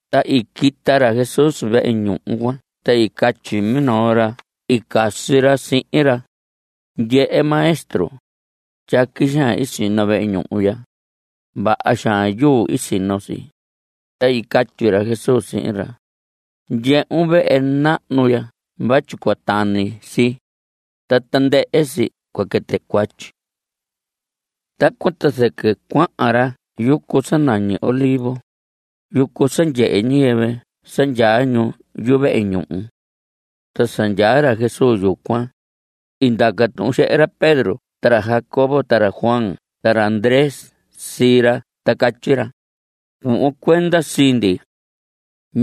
Ta i quita ra Jesús vehe ñuhu cuan ta i catyi minoo ra i casi ra sihin ra: ¡Ndyehe, Maestro, tyaqui xaan i sino vehe ñuhu ya! ¡Vaha xaan yuu i sino si! Ta i catyi ra Jesús sihin ra: Ndyehun vehe nahnu ya vatyi cua tani si, ta tandɨhɨ si cua quɨtɨ cuatyi. Tacuan ta zɨquɨ cuahan ra yucu sa nañi Olivos, yucu sa ndyehe ñiyɨvɨ sa ndyaa ñu yuvehe ñuhu. Ta sa ndyaa ra Jesús yucuan, i ndaca tuhun xehe ra Pedro ta ra Jacobo ta ra Juan ta ra Andrés sii ra ta catyi ra: Cuhvon cuenda sii ndi.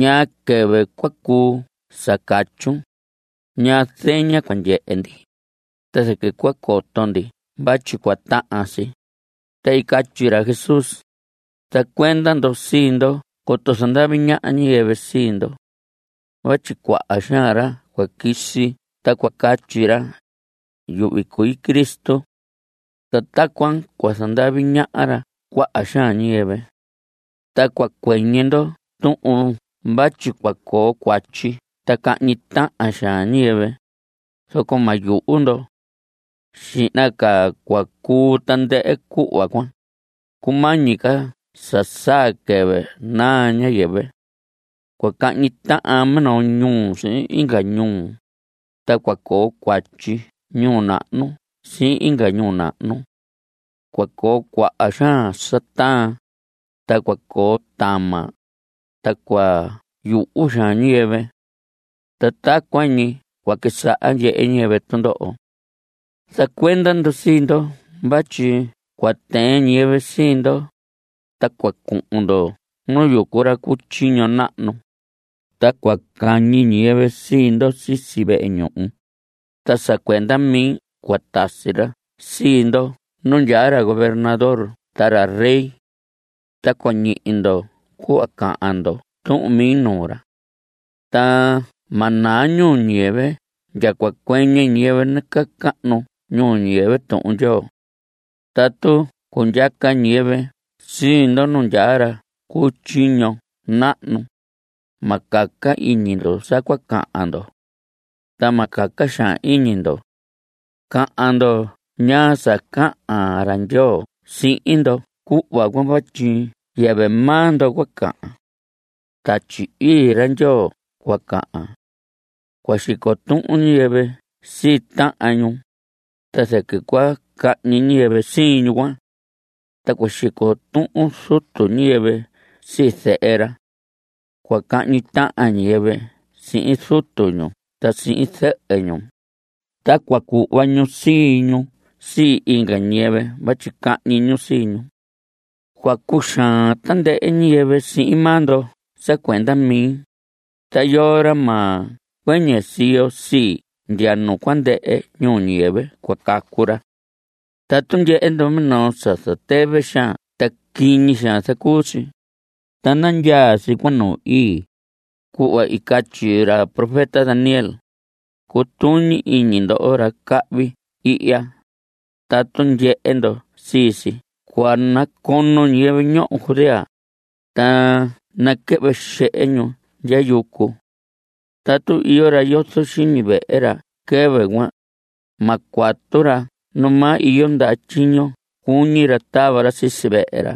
¿Ñaa quɨvɨ cua cuu sa catyun? ¿Ñaa zeña cua ndyehe ndi, ta zɨquɨ cua coto ndi vatyi cua tahan si? Ta i catyi ra Jesús: Zacuenda ndo sii ndo coto zandavi ñaha ñiyɨvɨ sii ndo. Vatyi cuaha xaan ra cua quisi ta cua catyi ra: “Yuhvi cui Cristo.” Ta tacuan cua zandavi ñaha ra cuaha xaan ñiyɨvɨ. Ta cua cuɨñɨ ndo tuhun vatyi cua coo cuatyi ta cahñi tahan xaan ñiyɨvɨ, zoco ma yuhu ndo. Xihna ca cua cuu tandɨhɨ cuhva cuan, cumañi ca sa saa quɨvɨ naa ñiyɨvɨ. Cua cahñi tahan minoo ñuu sihin inga ñuu, ta cua coo cuatyi ñuu nahnu sihin inga ñuu nahnu. Cua coo cuaha xaan sa taan, ta cua coo tama, ta cua yuhu xaan ñiyɨvɨ. Ta tacuan ñi cua quisaha ndyehe ñiyɨvɨ tundoho. Zacuenda ndo sii ndo vatyi cua tɨɨn ñiyɨvɨ sii ndo, ta cua cuhun ndo nu yucu ra cu tyiño nahnu. Ta cua cañi ñiyɨvɨ sii ndo sisi vehe ñuhu. Ta sa cuenda mi cua tasi ra sii ndo nu ndyaa ra gobernador ta ra rey. Ta cua ñihi ndo cuhva cahan ndo tuhun mi nuu ra. Ta ma naa ñuu ñiyɨvɨ ndya cua cuɨñɨ ñiyɨvɨ nacahnu ñuu ñiyɨvɨ Tuhun Ndyoo. Tatu cundyaca ñiyɨvɨ sii ndo nu ndyaa ra cu tyiño nahnu, ma caca iñi ndo sa cua cahan ndo. Ta ma caca xaan iñi ndo. Cahan ndo ñaa sa cahan ra Ndyoo sihin ndo cuhva cuan vatyi yɨvɨ maa ndo cua cahan. Tatyi Ii ra Ndyoo cua cahan. Cua xico tuhun ñiyɨvɨ sii tahan ñu, ta zɨquɨ cua cahñi ñiyɨvɨ sii ñu cuan. Ta cua xico tuhun zutu ñiyɨvɨ sii zehe ra. Cua cahñi tahan ñiyɨvɨ sihin zutu ñu ta sihin zɨhɨ ñu. Ta cua cuhva ñu sii ñu sii inga ñiyɨvɨ vatyi cahñi ñu sii ñu. Cua cuxaan tandɨhɨ ñiyɨvɨ sihin maa ndo sa cuenda mi, ta yoo ra ma cuɨñɨ siyo sii ndya nu cua ndɨhɨ ñuu ñiyɨvɨ, cua cacu ra. Tatu ndyehe ndo minoo sa zatɨvɨ xaan ta quiñi xaan zacuu si, ta nandyaa si cuan nu ii, cuhva i catyi ra profeta Daniel, cutuñi iñi ndo ndoho ra cahvi ihya, tatu ndyehe ndo sii si cuan, nacono ñiyɨvɨ ñoho Judea, ta naquɨhvɨ xehe ñu ndya yucu. Tatu iyo ra yozo xiñi vehe ra quɨvɨ cuan, ma cuatu ra numaa iyo ndaha tyiño cuñi ra tava ra sisi vehe ra.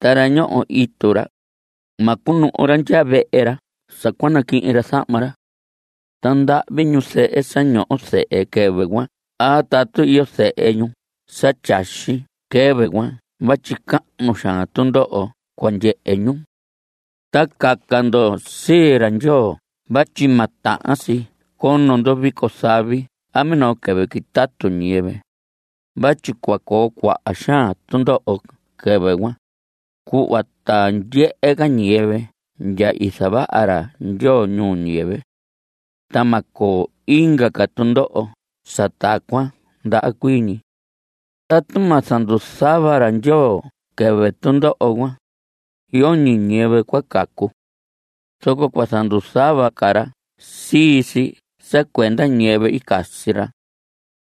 Ta ra ñoho itu ra, ma cunuhu ra ndya vehe ra sa cua naquihin ra zahma ra. Ta ndahvi ñu zɨhɨ sa ñoho zehe quɨvɨ cuan a tatu iyo zehe ñu sa tyaxi quɨvɨ cuan vatyi cahnu xaan tundoho cua ndyehe ñu. Ta caca ndo sii ra Ndyoo vatyi ma tahan si cono ndo vico zavi a minoo quɨvɨ quitatu ñiyɨvɨ vatyi cua coo cuaha xaan tundoho quɨvɨ cuan, cuhva ta ndyehe ca ñiyɨvɨ ndya i zavaha ra Ndyoo ñuu ñiyɨvɨ. Ta ma coo inga ca tundoho sa tacuan ndaha cuii ñi. Tatu ma zanduzuhva ra Ndyoo quɨvɨ tundoho cuan, yoñi ñiyɨvɨ cua cacu. Zoco cua zanduzuhva ca ra sii si sa cuenda ñiyɨvɨ i casi ra.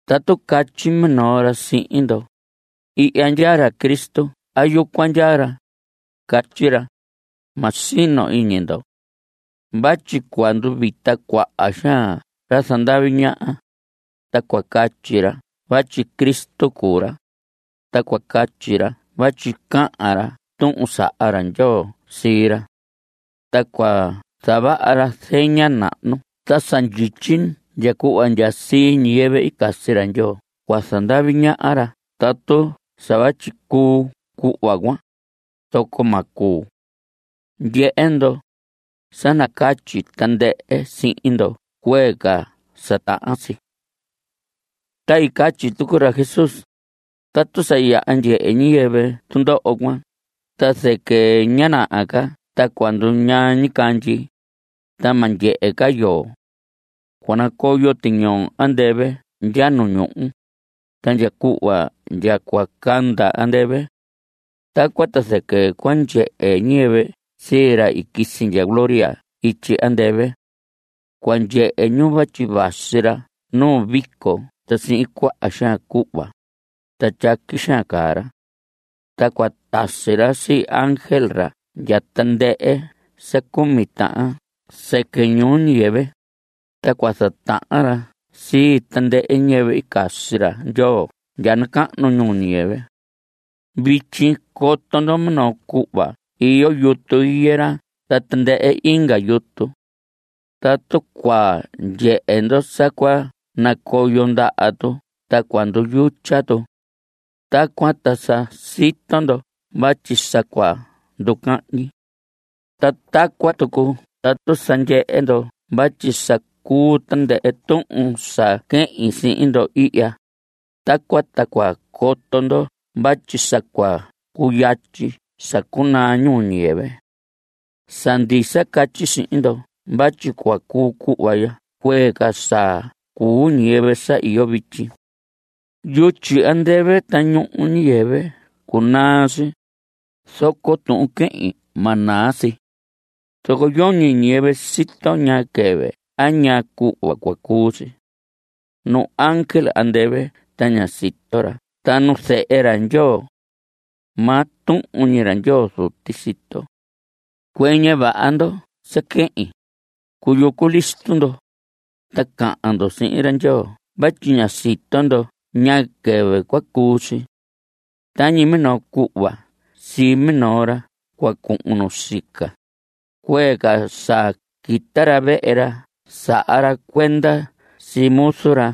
Tatu catyi minoo ra sihin ndo: “Ihya ndyaa ra Cristo a yucuan ndyaa ra”, catyi ra; ma sino iñi ndo. Vatyi cua nduvita cuaha xaan ra zandavi ñaha, ta cua catyi ra vatyi Cristo cuu ra, ta cua catyi ra vatyi cahan ra tuhun saha ra Ndyoo sii ra. Ta cua zavaha ra zeña nahnu ta sa ndyityi ndya cuhva ndya sii ñiyɨvɨ i casi ra Ndyoo cua zandavi ñaha ra tatu sa vatyi cuu cuhva cuan, zoco ma cuu. Ndyehe ndo, sa nacatyi tandɨhɨ sihin ndo cuee ca sa tahan si. Ta i catyi tucu ra Jesús: Tatu sa yaha ndyehe ñiyɨvɨ tundoho cuan ta zɨquɨ ña naha ca ta cua nduñaa ñicandyi, ta ma ndyehe ca yoo. Cua nacoyo tiñoo andɨvɨ ndya nu ñuhu, ta ndya cuhva ndya cua canda andɨvɨ. Tacuan ta zɨquɨ cua ndyehe ñiyɨvɨ sii ra i quisi ndya gloria ityi andɨvɨ. Cua ndyehe ñu vatyi vasi ra nu vico ta sihin cuaha xaan cuhva. Ta tyaqui xaan caa ra. Ta cua tasi ra sii ángel ra ndya tandɨhɨ sa cumi tahan sɨquɨ ñuu ñiyɨvɨ, ta cua zatahan ra sii tandɨhɨ ñiyɨvɨ i casi ra Ndyoo ndya nacahnu ñuu ñiyɨvɨ. Vityi coto ndo minoo cuhva iyo yutu higuera ta tandɨhɨ inga yutu. Tatu cua ndyehe ndo sa cua nacoyo ndaha tu ta cua nduyutya tu, tacuan ta sa sito ndo vatyi sa cua nducahñi. Ta tacuan tucu tatu sa ndyehe ndo vatyi sa cuu tandɨhɨ tuhun sa quehin sihin ndo ihya, tacuan ta cua coto ndo vatyi sa cua cuyatyi sa cunaa ñuu ñiyɨvɨ. Sa ndisa catyi sihin ndo vatyi cua cuu cuhva ya cuee ca sa cuu ñiyɨvɨ sa iyo vityi. Yutyi andɨvɨ ta ñuhu ñuu ñiyɨvɨ cunaa si, zoco tuhun quehin, ma naa si. Zoco yoñi ñiyɨvɨ sito ñaa quɨvɨ a ñaa cuhva cua cuu si. Nu ángel andɨvɨ ta ña sito ra ta nu Zehe ra Ndyoo. Maa tuhun ñi ra Ndyoo Zuti sito. Cuɨñɨ vaha ndo sa quehin; cuyucu listo ndo, ta cahan ndo sihin ra Ndyoo vatyi ña sito ndo ñaa quɨvɨ cua cuu si. Tañi minoo cuhva sii minoo ra cua cuhun nu sica, cuee ca sa quita ra vehe ra saha ra cuenda sii muzu ra.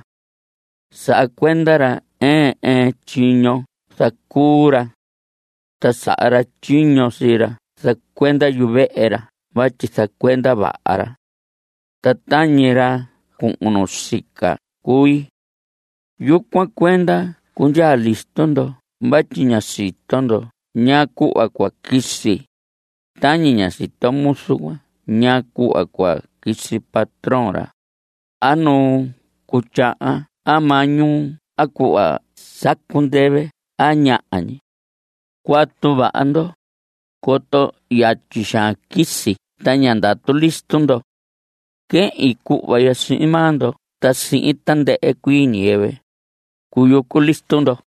Saha cuenda ra ɨɨn ɨɨn tyiño zacuu ra. Ta saha ra tyiño sii ra zacuenda yuvehe ra vatyi zacuenda vaha ra. Ta tañi ra cuhun nu sica cui. Yucuan cuenda cundyaa listo ndo vatyi ña sito ndo ñaa cuhva cua quisi, tañi ña sito muzu cuan ñaa cuhva cua quisi patrón ra, a nu cuu tyahan a maa ñuu a cuhva sacu ndɨvɨ a ñaha ñi. Cuatu vaha ndo, coto yatyi xaan quisi ta ña ndatu listo ndo. Quehin cuhva ya sihin maa ndo ta sihin tandɨhɨ cuii ñiyɨvɨ: Cuyucu listo ndo.